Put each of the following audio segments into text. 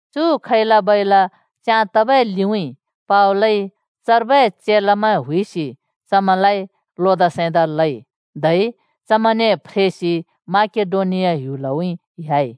चु खैला-बैला च्याँ तबै लिउँइँ पावलइ चर्बै चेलामैं हुइसि चमैंलाइ अर्थि पिंइ। धै चमैंने फ्रेसि माकेडोनिया ह्‍युलउँइँ ह्‍याइ।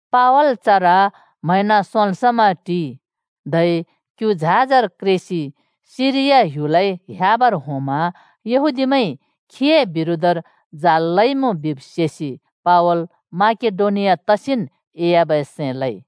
पावल चर म्हैंन सोंल् समा टिइ। धै क्यु झाजर क्रेसि सिरिया ह्‍युलउँइँ ह्‍याबर होंमा यहूदीमैंइ चए बिरोधर जाल लइमुँ बिब् सेसि पावल माकेडोनिया तसिन् एह्‍याबै सैं लइ।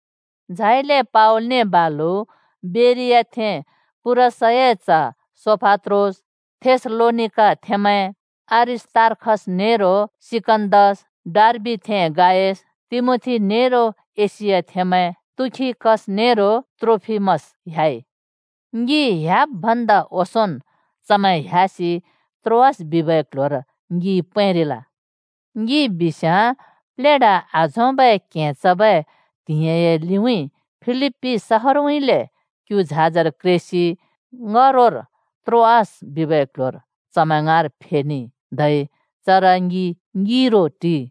झाइले पावलने बालु बेरियाथें पुरसए च्ह सोपात्रोस, थेसलोनिकाथेंमैं अरिस्‍तार्खस नेरो सिकन्‍दस, डर्बिथें गायस, तिमोथी, नेरो एशियाथेंमैं तुखिकस नेरो त्रोफिमस ह्‍याइ। ङि ह्‍याब् भन्दा ओंसोंन् चमैं ह्‍यासि त्रोआस बजारर ङि पैंरिल। ङि बिस्याँ प्लेढा आझोंबै क्हें चबै त्हिंइए लिउँइँ फिलिप्‍पी शहारउँइँले क्यु झाजर क्रेसि ङ्‍हरोर त्रोआस बजारर चमैं ङाँर फेखइ, धै चर ङि ङिरो टिइ।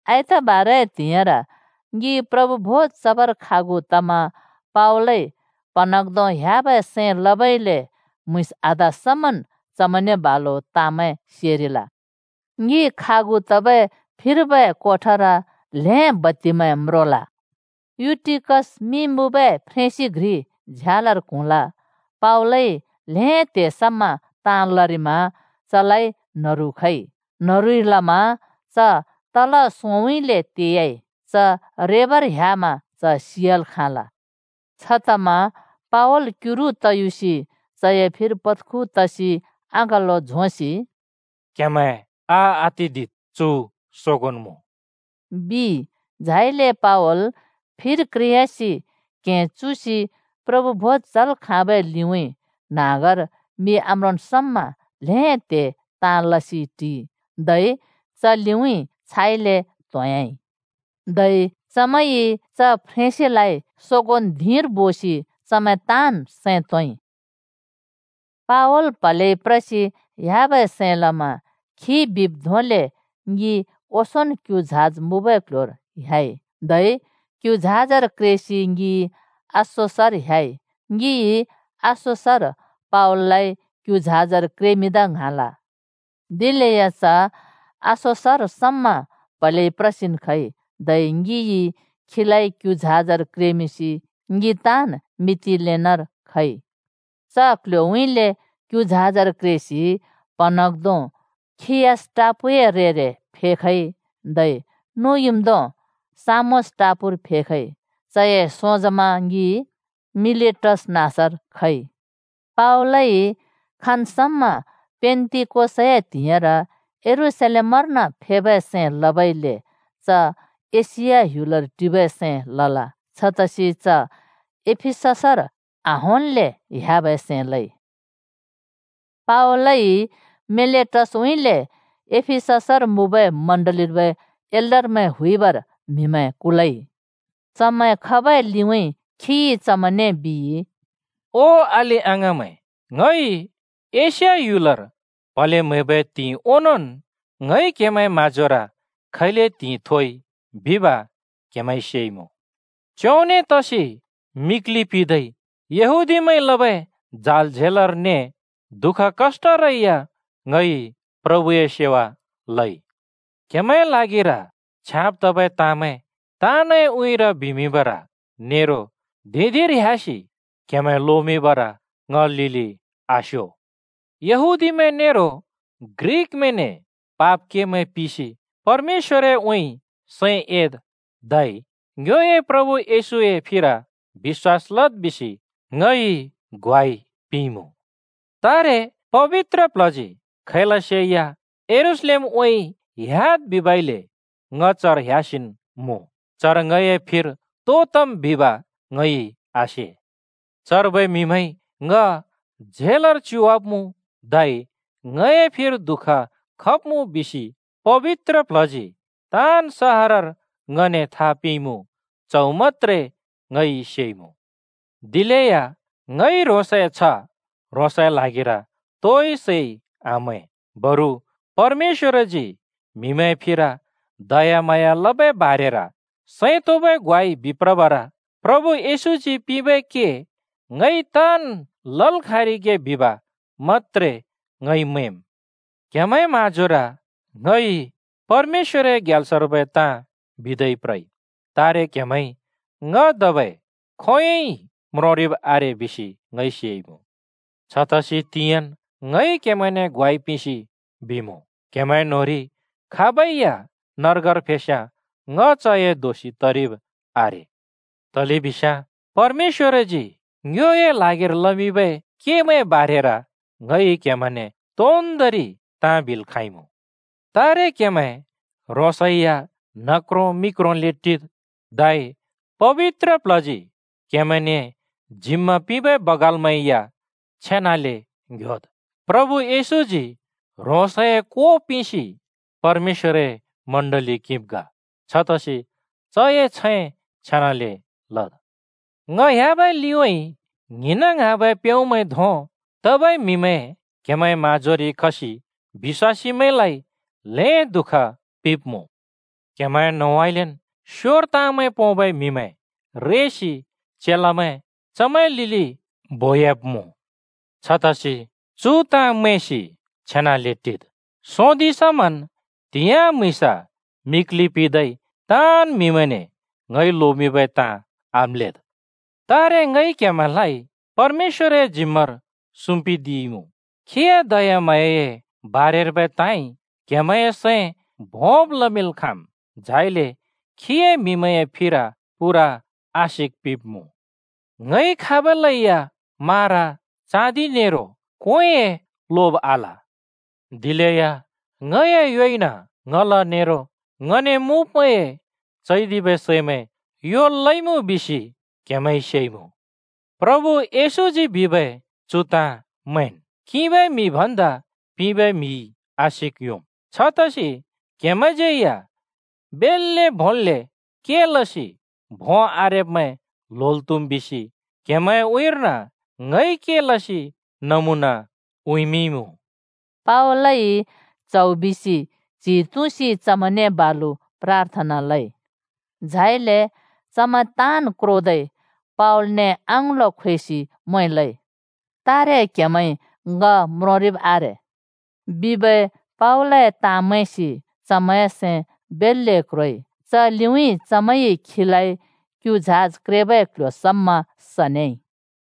आइतबार त्हिंइर ङि प्रभु भोज चबर खागु तमा पावलइ प्हँन्हाँग्धों ह्‍याबै सैं लबइले म्‍हुँइँस आधा समन् चमैंने बालु ताँमैं सेरिल। ङि खागु तबै फिर्बै कोठर ल्हें बत्तिमैं म्रोल। युटिकस मिं मुँबै फ्रेंसि घ्रि झ्यालर क्हुँल। पावलइ ल्हें त्हे समा ताँ लरिमा चलाइ न्हरु खइ। न्हरुइ लमा च तल सोंउँइँले तेयाइ। च रेबर ह्‍यामा च सियाल् खाँना। छतमा पावल क्युरु तयुसि चए फिर पत्खु तसि अँगलो झोंसि “क्हेमैं आआतिद्। चु सोगोंन् मुँ!” बिइ। झाइले पावल फिर क्रेयासि क्हें चुसि प्रभु भोज चल् खाँबै लिउँइँ न्हाँगर मि आम्रोंन् समा ल्हें त्हे ताँ लसि टिइ, धै च लिउँइँ फ्रेयाइ। धै चमैंइ च फ्रेंसिलाइ सोगोंन् धिंर बोसि चमैं ताँन् सैं तोंइ। पावल प्हलेइ प्रसि ह्‍याबै सैं लमा खिइ बिब् धोंले ङि ओंसोंन् क्यु झाज मुँबै क्ल्ह्‍योर ह्‍याइ, धै क्यु झाजर क्रेसि ङि अस्‍सोसर ह्‍याइ। ङिइ अस्‍सोसर पावललाइ क्यु झाजर क्रेमिंदा ङ्हाँल। दिलेया च अस्सोसर समा प्हलेइ प्रसिन् खइ, धै ङिइ खीलाइ क्यु झाजर क्रेमिंसि ङि ताँन् मितिलेनेर खइ। च क्ल्ह्‍योउँइँले क्यु झाजर क्रेसि प्हँन्हाँग्धों खियस टापूए रेर फेखइ, धै नुँइम्धों सामोस टापूर फेखइ। चए सोंजमा ङि मिलेटस नाँसर खइ। पावल खाँन् समा पेन्‍तिकोसए त्हिंइर यरूशलेमर्न फेबै सैं लबइले च एशिया ह्‍युलर टिबै सैं आल। छतसि च एफिससर आहोंल्‍ले ह्‍याबै सैं लइ। पावलइ मिलेटसउँइँले एफिससर मुँबै चर्चर्बै एल्डरमैं हुइबर म्हिमैं कुलइ। चमैं खबै लिउँइँ खिइ चमैंने बिइ: “ओ अलि-अङाँमैं ङइ एशिया ह्‍युलर प्हले म्हैबै त्हिंइ ओंनोंन् ङइ क्हेमैंए म्हाँजोर खैले त्हिंइ थोइ बिब क्हेमैंइ सेइमुँ। च्योंने तसि मिक्लि पिदै यहूदीमैंइ लबै जाल झेलर ने दुःख कष्‍टरै या ङइ प्रभुए सेवा लइ। क्हेमैंए ल्हागिर छ्याँब तबै ताँमैं ताँनए उँइँर बिमिंबर नेरो धिं-धिंर ह्‍यासि क्हेमैं लोमिंबर ङ लिलि आस्यो। यहूदीमैं नेरो ग्रिकमैंने पाप केमैं पिसि परमेश्‍वरउँइँ सैं एद् धै ङ्योए प्रभु येशूए फिर बिश्‍वास लद् बिसि ङइ ग्वाइ पिंइँमुँ। “तारे पबित्र प्ल्हजी खैलसे या यरूशलेमउँइँ ह्‍याद् बिबइले ङ चर ह्‍यासिन् मुँ। चर ङए फिर तो तम् बिब ङइ आसे। चर्बै म्हिमैंइ ङ झेलर च्युवाब्मुँ धै ङए फिर दुःख खब्मुँ बिसि पबित्र प्ल्हजी ताँन् सहरर ङने था पिंइँमुँ, च्हौ मत्‍त्रे ङइ सेइमुँ। दिलेया ङइ ह्रोंसए छ्ह ह्रोंसए ल्हागिर तोइ सैइ आमैं। बरु परमेश्‍वरजी म्हिमैंए फिर दयाम्हाँया लबै बारेर सैं तोंबै ग्वाइ बिप्रबर प्रभु येशूजी पिंबै के ङइ ताँन् लल् खाँरिगे बिब् मत्‍त्रे ङइ मैंम्। “क्हेमैंए म्हाँजोर ङइ परमेश्‍वरए ग्याल्सर्बै ताँ बिदै प्रइ, तारे क्हेमैंइ ङ धबै खोंयोंन् बिलै म्रोंरिब् आरे बिसि ङइ सेइमुँ। छतसि तिंयाँन् ङइ क्हेमैंने ग्वाइ पिंसि बिमुँ, क्हेमैं न्होंरि खाबै या नर्गर फेस्‍याँ ङ चए दोषि तरिब् आरे। तलेबिस्याँ परमेश्‍वरजी ङ्योए ल्हागिर लमिंबै केमैंए बारेर ङइ क्हेमैंने तोन्दोंरि ताँ बिल् खाँइँमुँ। तारे क्हेमैं ह्रोंसै या न्ह क्रों मि क्रोले टिद्, धै पबित्र प्ल्हजी क्हेमैंने जिम्मा पिंबै बगालै या छेनाले ङ्‍ह्‍योद्। प्रभु येशूजी ह्रोंसए को पिंसि परमेश्‍वरए चर्च किंब् ग। छतसि चए छैं छेनाले लद्। ङ ह्‍याबै लिउँइँ ङ्हिंन् ङ्हाँबै प्याउँमैं धों तबै म्हिमैं क्‍हेमैंए म्‍हाँजोरि खसि बिश्‍वासीमैंलाइ ल्हें दुःख पिंब्‍मु। क्‍हेमैंए न्होंउँइँलेन् स्‍योर ताँमैं पोंबै म्हिमैं रेसि चेलामैं चमैंए लिलि बोयाब्मुँ। छतसि चु ताँ मैंसि छेनाले टिद्! सोंदिं समन् त्हिंयाँ म्‍हुँइँसा मिक्लि पिंदै ताँन् म्हिमैंने ङइ लोमिंबै ताँ आम्‍लेद्। “तारे ङइ क्‍हेमैंलाइ परमेश्‍वरए जिम्‍मार सुम्‍पिदिइमुँ। खीए दयाम्हाँयाए बारेर्बै ताँइ क्‍हेमैंए सैं भोंब् लमिंल् खाँम्, झाइले खीए म्‍हिमैंए फिर पूरा आशिक पिंब्‍मुँ। ङइ खाबलै या मारा, चाँदि नेरो क्वेंए लोब आल। दिलेया ङए योइन ङला नेरो ङने मुँब्मैंए चैदिबै सैमैं योल् लइमुँ बिसि क्हेमैंइ सेइमुँ। प्रभु येशूजी बिबै चु ताँ मैंन्, ‘किंबै म्हि भन्दा पिंबै म्हिइ आशिक् योंम्।’ छतसि क्हेमैंज्यै या बेल्‍ले भोंले के लसि भों आरेब्मैं ल्होल् त्हुम् बिसि क्हेमैंए उँइँर्न ङइ के लसि नमुना उँइँमिंइँमुँ।” पावलइ च्हौ बिसि च्हि तुँसि चमैंने बालु प्राथना लइ। झाइले चमैं ताँन् क्रोसि पावलने अँगलो झोंसि म्वें लइ। “तारे क्हेमैंइ ङ म्रोंरिब् आरे” बिबै पावलए ताँ मैंसि चमैंए सैं बेल्‍ले क्रोइ। च लिउँइँ चमैंइ चलाइ क्यु झाज क्रेबै क्ल्ह्‍यो समा सनेइ।